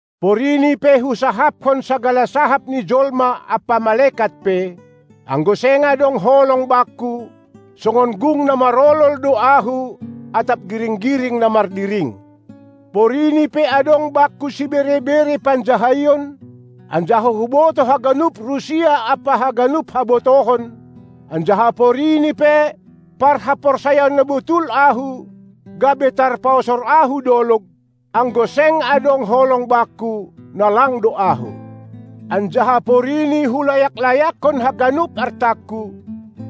Porini pe husahapkon sagala sahap ni jolma ampa malekat pe, anggo seng adong holong bakku, songon gung na marolol do ahu atap giring-giring na mardiring. Porini pe adong bakku sibere-bere panjahaion, anjaha hubotoh haganup rusia ampa haganup habotohon, anjaha porini pe parhaporsayaon na botul ahu gabe tarpaosor ahu dolog, anggo seng adong holong bakku, na lang do ahu. Anjaha porini hulayak-layakkon haganup artangku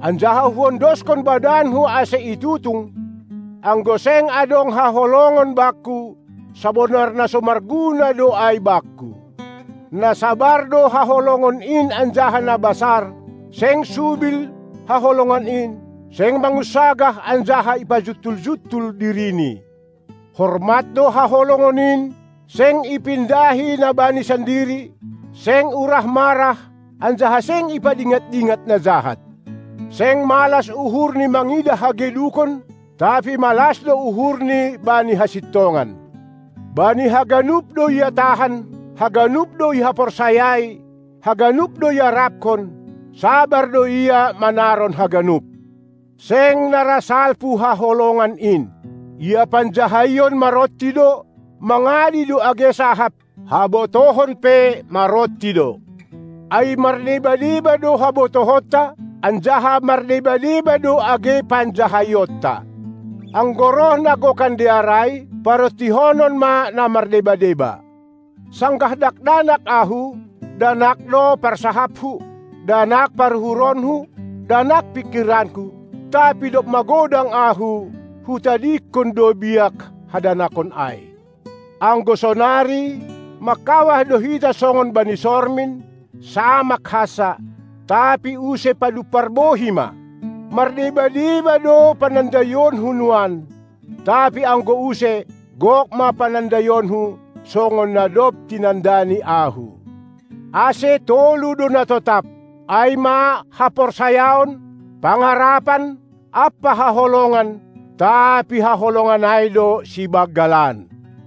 anjaha huondoskon badanku ase itutung, anggo seng adong haholongon bakku, sabonar na so marguna do ai bakku. Na sabar do haholongon in anjaha na basar, seng subil haholongon in, seng mangunsagah anjaha ipajuntul-juntul dirini. Hormat do haholongon in, seng ipindahi na bani sandiri, seng urah marah, anjaha seng ipadingat-dingat na jahat. Seng malas uhurni mangidah hagedukon, tapi malas do uhurni bani hasintongan. Bani haganup do ia tahan, haganup do ihaporsayai, haganup do iarapkon, sabar do ia manaron haganup. Seng na ra salpu haholongan in. Ia panjahaion maronti do, mangadi do age sahap, habotohon pe maronti do. Ai mardeba-deba do habotohonta, anjaha mardeba-deba do age panjahaionta. Anggo roh na gokan dear ai, parontihonon ma na mardeba-deba. Sanggah dakdanak ahu, danak do parsahapku, danak paruhuronku, danak pingkiranku, tapi dob mangodang ahu, hutadingkon do biak hadanakon ai. Anggo sonari, mangkawah do hita songon bani sormin, samak hansa, tapi use padumpar bohi ma. Mardeba-deba do panandaionku nuan, tapi anggo use gok ma panandaionku, songon na dob tinandani ahu. Ase tolu do na totap, ai ma haporsayaon, pangarapan ampa haholongan tapi haholongan ai do sibanggalan.